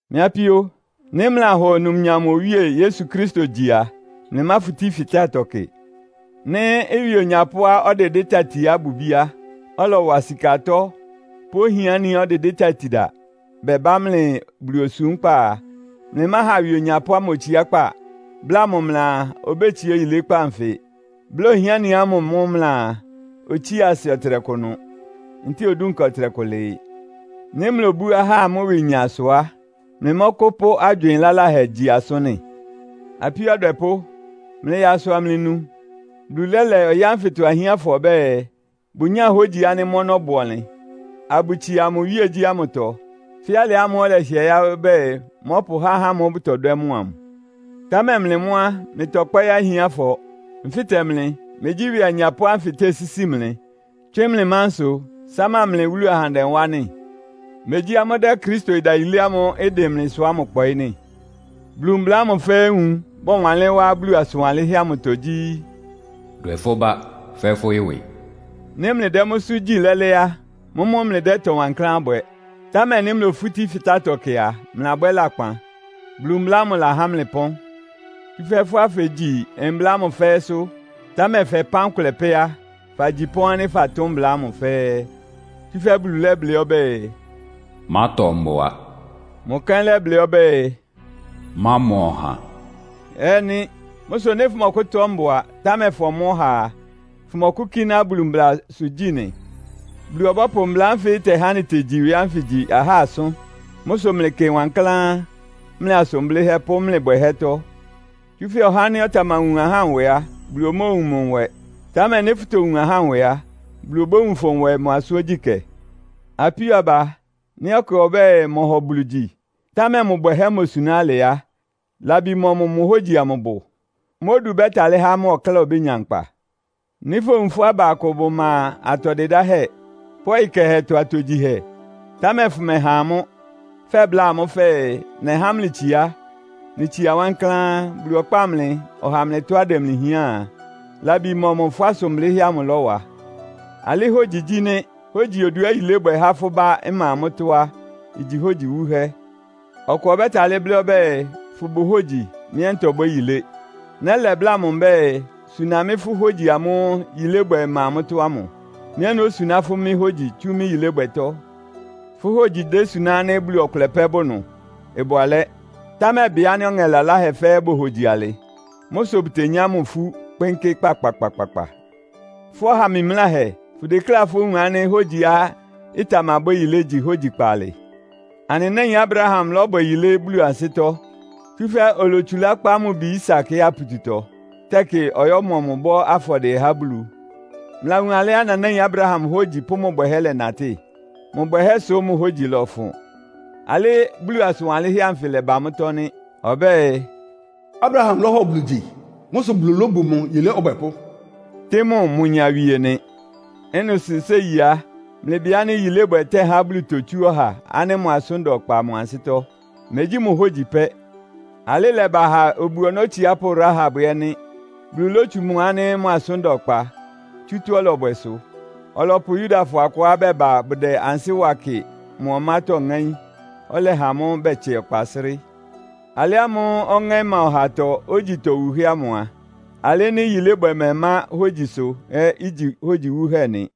Mɩ́ apíó, nɩ́ mlɩlahɔ numnyam Owíe Yesu Kristo gyi a, mlɩmáfutí fɩtátɔ kɩ. Nɩ́ ɩwɩ onyapʋ́á ɔdɩdɩ́ tatiá ɩbʋ ibíá, ɔlɔwa sika atɔ́ pʋ́ ohiániá ɔdɩdɩ́ tatida bɛbá mlɩ Bulu osúmkpá a, mlɩmáha ɩwɩ onyapʋ́ ámʋ otsiákpá, bláa mʋ mlɩaa, obétsiá oyilékpá nfɩ; bláa ohiáni ámʋ mʋ́ mlɩaa, otsía asɩ ɔtɩnɛkʋ ɩnʋ, ntɛ́ɛ odúnka ɔtɩnɛkʋ lɩɩ. Nɩ́ mlobú ahá amʋ́ ɩwɩnya sʋ á, mlɩmɔ́kʋ́pʋ́ agywɩɩn laláhɛ gyi asʋ́n nɩ́? Apíó adwɛpʋ́, mlɩyaa asʋ amlɩnu. Bulu lɛ́lɛ ɔyɩ́ ánfɩtɔ ahiánfɔ ɔbɛ́ɛ, bʋnyáa hógyi ánɩ́ mʋ́ ɔnɔ́ bʋ ɔnlɩn, abʋtsia mʋ iwíegyí ámʋtɔ, fɛ́ alɩ ámʋ́ʋ́ ɔlɛhɩɛ yáɩ́ ɔbɛ́ɛ, mɔ́pʋhá ahá ámʋ́ʋ́ bʋtɔdwɛ́ mʋ amʋ. Támɛ mlɩ mʋ́ á, mlɩtɔkpɔ́ɩ́ ahiánfɔ. Nfɩ́tɛ mlɩ, megyí ɩwɩ anyapʋ́ ánfɩ tesísi mlɩ, tswɩ́n mlɩ mánsʋ, sáma mlɩ wúlu ahandɛ wá nɩ́? Megyí amʋ́ dɛ́ Kristo ɩdayilé ámʋ́ʋ́ ɩdɩn mlɩsʋ ámʋ kpɔɩ́ nɩ́? Bulu mbla ámʋ fɛ́ɛ́ nwun, bɔwanlɩ́n wá Bulu asʋn wanlɩ́nhɛ́ amʋtɔ gyí, “Dwɛ fʋ́ bá fɛ́ fʋ́ ɩwɩ.” Nɩ́ mlɩdɛ́ mʋ́sʋ́ gyi lɛ́lɛ́ á, mʋ́mʋ́ mlɩdɛ́ ɩtɔ wankláán bwɛ. Támɛ nɩ́ mlofútí fɩtátɔ kɩ a, mlɩlabwɛ́ lakpan. Bulu mbla ámʋ lahá mlɩ ɩpɔ́n. Tsúfɛ́ fʋ́á fegyi mbla ámʋ fɛ́ɛ́sʋ́, támɛ fɛpán kʋlɛ pɛ́ á, fagyi pɔ́n ánɩ́ fatʋ́n mbla ámʋ fɛ́ɛ́. Tsúfɛ́ Bulu lɛ́blɩ́ ɔbɛ́ɛ, “Mátɔ mbʋa.” Mʋ kɛ́n lɛ́blɩ́ ɔbɛ́ɛ, “Mámɔ ɔha” ɛ́ nɩ́. Mʋ́ sʋ nɩ́ fʋmɔkʋ́tɔ́ mbʋa, támɛ famɔ́ ɔha a, fʋmɔkʋ́kíná Bulu mblasʋ gyí nɩ? Bulu ɔbɔ́pʋ mbla ánfɩ́ ɩtɛhá anɩtegyi ɩwɩ ánfɩ gyi ahá asʋ́n. Mʋ́ sʋ mlɩkɩ wankláán, mlɩ asʋn blɩ́hɛ́ pʋ́ mlɩ bwɛhɛ́tɔ́. Tsúfɛ́ ɔhá ánɩ́ ɔtamawun ahá nwɛ á, Bulu omóowun mʋ nwɛ. Támɛ nɩ́ fʋtowun ahá nwɛ á, Bulu obówun fʋ nwɛ mʋ asʋ́n ogyíkɛ́. Apíó aba, nɩ́ ɔkʋ ɔbɛ́ɛ, mɔhɔ Bulu gyi, támɛ mʋ bwɛhɛ́ mosuná alɩ á, labi mɔmʋ mʋ hógyi amʋ bʋ? Mʋ́ odu ɩbɛ́talɩ́ há mʋ ɔkláa obénya nkpa? Nɩ́ fowun fʋ́ aba akʋ bʋma atɔ dɩdáhɛ́ pʋ́ ɔyɩ kɛhɛtɔ atogyihɛ, támɛ fʋmɛha amʋ́, fɛbláa amʋ́ fɛɛ, “Nɛhá mlɩ itsiá. Mlɩtsia wankláán. Bulu ɔkpáa mlɩ, ɔha mlɩ tɔ́á ɩdɛ mlɩ hián” a, labi mɔmʋ fʋ́ asʋn blɩ́hɛ́ amʋ ɩlɔwa? Alɩ́ hógyi igyi nɩ́. Hógyi oduá yilébwɛ há fʋ́ bá ɩma mʋ́tɔ́ á, igyi hógyi wúhɛ́. Ɔkʋ ɔbɛ́talɩ́ blɩ́ ɔbɛ́ɛ “Fʋbʋ hógyi. Mɩ́ ɛ́ ntɔbwɛ́ yilé.” Nɛ́lɛ bláa mʋ mbɛ́ɛ, “Suna mɩ́ fʋ́ hógyi amʋ́ʋ́ yilébwɛ ɩma mʋ́tɔ́ ámʋ. Mɩ́ ɛ́ nósuná fʋ́ mɩ́ hógyi tsú mɩ́ yilébwɛtɔ́.” Fʋ́ hógyi desuná ánɩ́ Bulu ɔkʋlɛ pɛ́ bʋ ɩnʋ? Ɩbʋ alɛ́! Támɛ bɩ ánɩ́ ɔŋɛ laláhɛ fɛ́ɛ́ bohogyi alɩ. Mʋ́ sʋ bʋtenyá mʋ ifú, kpɩ́nkɩ́ kpakpakpakpa. Fʋ́ ɔha mimláhɛ, fʋdekléá fówun ánɩ́ hógyiá ɩtamabwɛ́ yilé igyi hógyi kpaalɩ? Anɩ náin Abraham lɔ́bwɛ yilé Bulu ansɩ́tɔ́, tsúfɛ́ olotsulá kpá mʋ bi Isak yáa pututɔ, tɛkɩ ɔyɔ́mɔ mʋ bɔ́ afɔdɩɛ há Bulu. Mlɩlawun alɩá nanáin Abraham hógyi pʋ́ mʋ bwɛhɛ́ lɛnatɩ́? Mʋ bwɛhɛ́ sʋ mʋ hógyi lɔfʋn. Alɩ́ Bulu asʋn wanlɩ́nhɛ́ anfɩ ɩlɛba mʋ́tɔ́ nɩ́. Ɔbɛ́ɛ, “Abraham lɔ́hɔ Bulu gyi. Mʋ́ sʋ́ Bulu lóbu mʋ yilé ɔbwɛpʋ́,” tɩ́ mʋ mʋ nyawie nɩ. Ɩ́nɩ sʋ séi á, mlɩbɩ ánɩ́ yilébwɛ tɛ́há Bulu totsú ɔha ánɩ́ mʋ asʋ́n da ɔkpa mʋ ansɩ́tɔ́, megyí mʋ hógyi pɛ́. Alɩ́ ɩlɛba ha obu-ɔnɔ́ otsiápʋ́ Rahab ɛ́ nɩ́. Bulu lótsu mʋ ánɩ́ mʋ asʋ́n da ɔkpa, tsú tɔ́á ɔlɔbwɛ sʋ. Ɔlɔpʋ Yudafɔ akʋá bɛba bʋdɛ ansɩ́ wa kɩ mʋ ɔmátɔ́ ŋáín, ɔlɛha amʋ́ bɛtsɛ ɔkpa srɩ́. Alɩ ámʋ́ʋ́ ɔŋɛ́ ɩma ɔhatɔ ógyi itowuhɛ́ ámʋ a, alɩ nɩ́ yilébwɛ mɛmá hógyisʋ ɛ́ igyi hógyi wúhɛ́ nɩ.